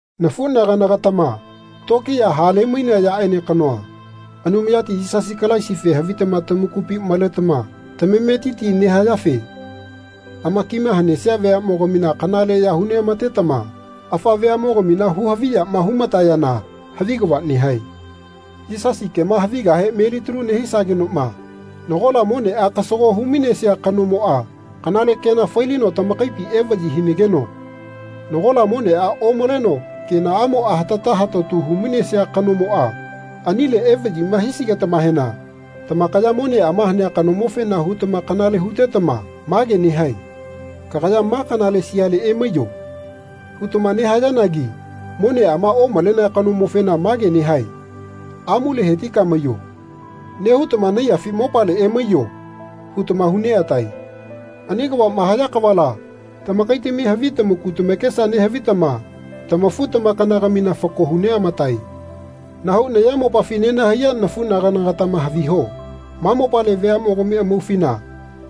Nafunagana-gatama tokiya hale-mainea yaaene kanoa, Anumayati Yisasi Kalaisife havitama tamakupi maletama tamametiti nehayafe amakima hanesia veamogamina kanaleya hu neamatetama afa veamogamina hu-haviyama humatayana havi kava nehae. Yisasi kema havigahe melitalu nehisagenoma nagola monea kasago hu-mainesia kanomoa kanale kena fai-lino tamakaipi evayi hinageno nagola monea omaleno kenaamoa hatata hatatu hu-mainesia kanoma anile evayima hisigetamahena tamakaya moneama hanea kanomofena hutama kanale hutetama mage nehae Kagaya ma kanale siale emaiyo. hutama nehayanagi moneama omalenea kanomofena mage nehae Amuale hetika maiyo. nehutama Naiyafi mopale emaiyo. hutama hu neatae. Ani kavama haya kavala tamakaitami havi tamaku tamakesa nehavitama tamafu-tamakana-gamina fako hu neamatae. Nahau nayamopafi nenahaiya nafunagana-gatama haviho. Ma mopale veamogami amaufina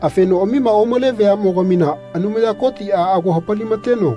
afenoamima omale veamogamina Anumaya Kotia ago hapali-mateno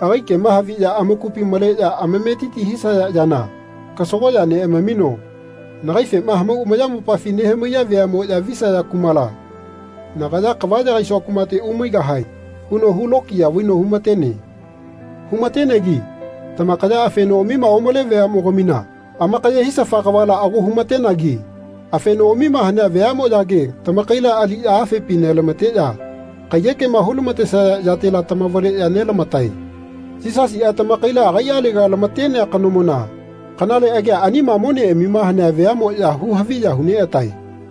agai kema haviya amakupi maleya amametiti hisaya yana kasagoya neamamino Nagaifema hamau ayamopafi nehamaiya veamoya visaya kumala, nagaya kava yagaisua kumate umaigahae. huno hu lokiya vaino hu-matene. Hu-matenegi tamakaya afenoamima omale veamogamina amakaye hisafa kavala ago hu-matenagi afenoamima hanea veamoyage tamakaila aliya afepi nelamateya kaiyekema hulamatesaya yatela tamavaleya nelamatae. Yisasia, tamakaila agaialega lamatenea kanomona kanale agia anima moneamima hanea veamoya hu-haviya hu neatae.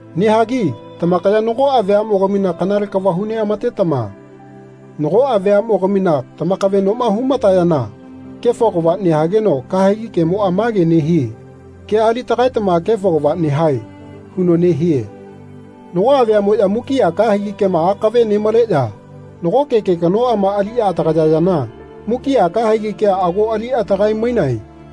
Nehagi tamakaya nagoa veamogamina kanale kava hu neamatetama nagoa veamogamina tamakavenoma hu-matayana kefo kava nehageno kahegi kemoa mage nehie Kea ali tagaetama kefo kava nehae. huno nehie. Nagoa veamoya mukia kahegi kema akave nemaleya nagoke ke kanoama aliya atagayayana mukia kahegi kea ago ali atagae-mainae.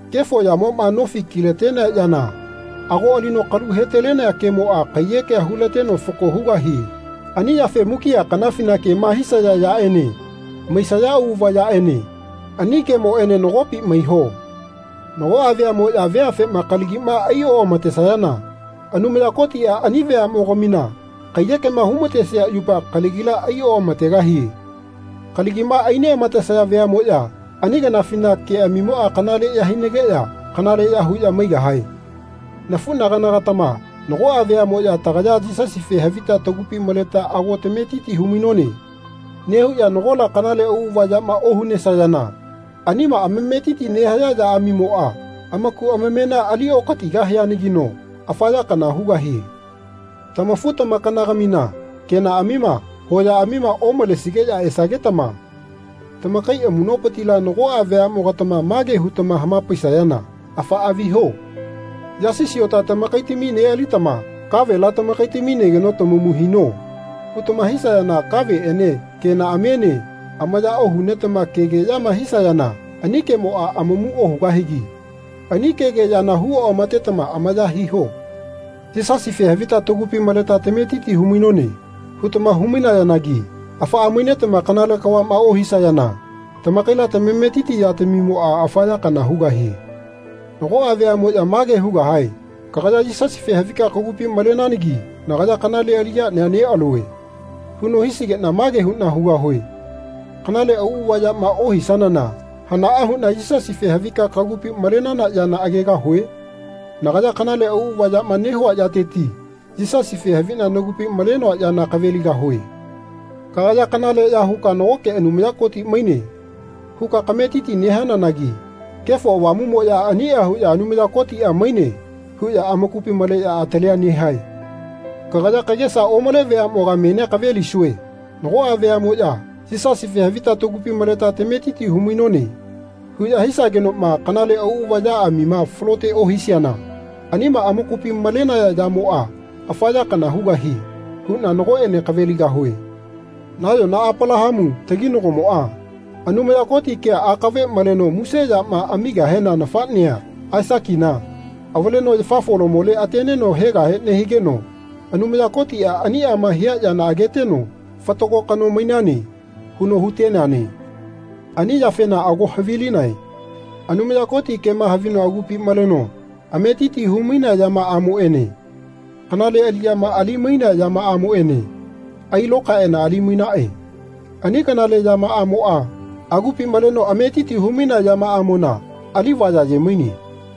Kefo yamoma nofi kilatenea yana ago alino kalu helatenea kemoa kaiyekea hulateno fako hugahie. Ani yafe mukia kanafina kema hisaya yaene maisaya auava yaene ani kemoene nagopi maiho. Nagoa veamoya veafema kalagima ai oamatesayana Anumaya Kotia ani veamogamina kaiyekema humatesia yupa kalagila ai oamategahie. Kalagima ai neamatesaya veamoya ani kanafina keamimoa kanaleya hinageya kanaleya huya maigahae. Nafunagana-gatama nagoa veamoya Tagaya Yisasife havita tagupi maleta ago tametiti hu-mainone. nehuya nagola kanale auava yama ohunesayana anima amametiti nehaya yaamimoa amaku amamena ali okatigahianagino afa ya kana hugahie. Tamafu-tamakana-gamina kenaamima hoyaamima omalesigeya esagetama tamakai amunopitila nagoa veamogatama mage hutamama hamapaisayana Afaa viho. Yasi siota tamakaitami nealitama kavela tamakaitami negeno tamamu hino. hutama hisayana kaveene kenaamiene amaya ohunetama kegeyama hisayana ani kemoa amamu ohugahigi ani kegeyana hu oamatetama amaya hiho. Yisasife havita tagupi maleta tametiti hu-mainone. hutama hu-mainayanagi afaa mainetama kanale kavama ohisayana tamakaila tamametiti yatamimoa afa ya kana hugahie. Nagoa veamoya mage hugahae Kagaya Yisasife havika kagupi malenanagi nagaya kanale aliyania nealue. huno hisigena mage huna hugahue Kanale auava yama ohisanana hanaa huna Yisasife havika kagupi malenana yana agegahue? Nagaya kanale auava yama nehua yateti Yisasife havina nagupi malenoa yana kaveligahue. Kagaya kanaleya huka Nagoke Anumaya Koti maine. huka kametiti nehananagi Kefo Avamumoya ania huya Anumaya Kotia maine. huya amakupi maleya atalia nehae. Kagaya kagesa omale veamoga menia kavelisue. Nagoa veamoya Yisasife havita tagupi maleta tametiti hu-mainone. huya hisagenoma kanale auava yaamima falote ohisiana anima amakupi malenaya yamoa afa ya kana hugahie huna nagoene kaveligahue. Nayona Apalahamu, taginagomoa, Anumaya Koti kea akave maleno muse yama amigahena nafanea, Aisakina, avaleno yafa folamole ateneno hegahe nehigeno Anumaya Kotia aniama hia yana ageteno Fatago kano mainane. huno huteneane. Ani yafena ago havilinae Anumaya Koti kema havino agupi maleno ametiti humainea yamaamoene kanale aliyama ali-mainea yamaamoene ailokaeana ali-mainae. Ani kanale aliyamaamoa agupi maleno ametiti hu-mainea yamaamona alivaya aye-maine.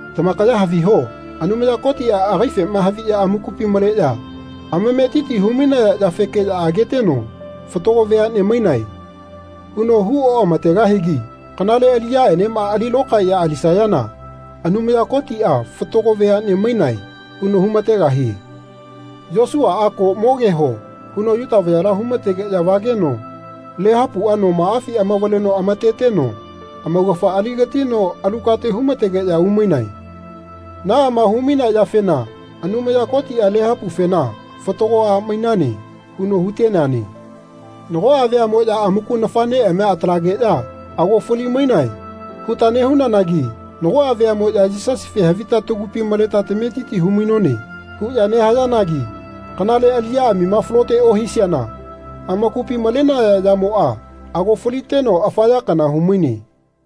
Tamakaya haviho Anumaya Kotia agaifema haviya amakupi maleya ametiti hu-mainaya yafekeya ageteno Fatago veane mainae. huno hu omategahigi kanale aliyaenema ali lokaeya alisayana Anumaya Kotia Fatago veane mainae. huno hu-mategahie. Yosuaa Ko mogeho. huno Yuta vayala humategeya vageno Lehapua nomaafi amavaleno amateteno amaugafa aligatino alu kate hu-mategeya umainae. Naama humainea yafena Anumaya Kotia Lehapufena Fatago a mainane. huno huteneane. Nagoa veamoya amaku nafaneamia atalageya Ago fali-mainae. huta nehunanagi nagoa veamoya Yisasife havita tagupi maleta tametiti hu-mainone. huya nehayanagi kanale aliyaamima falote ohisiana amakupi malenaya yamoa ago faliteno afa ya kana humaine.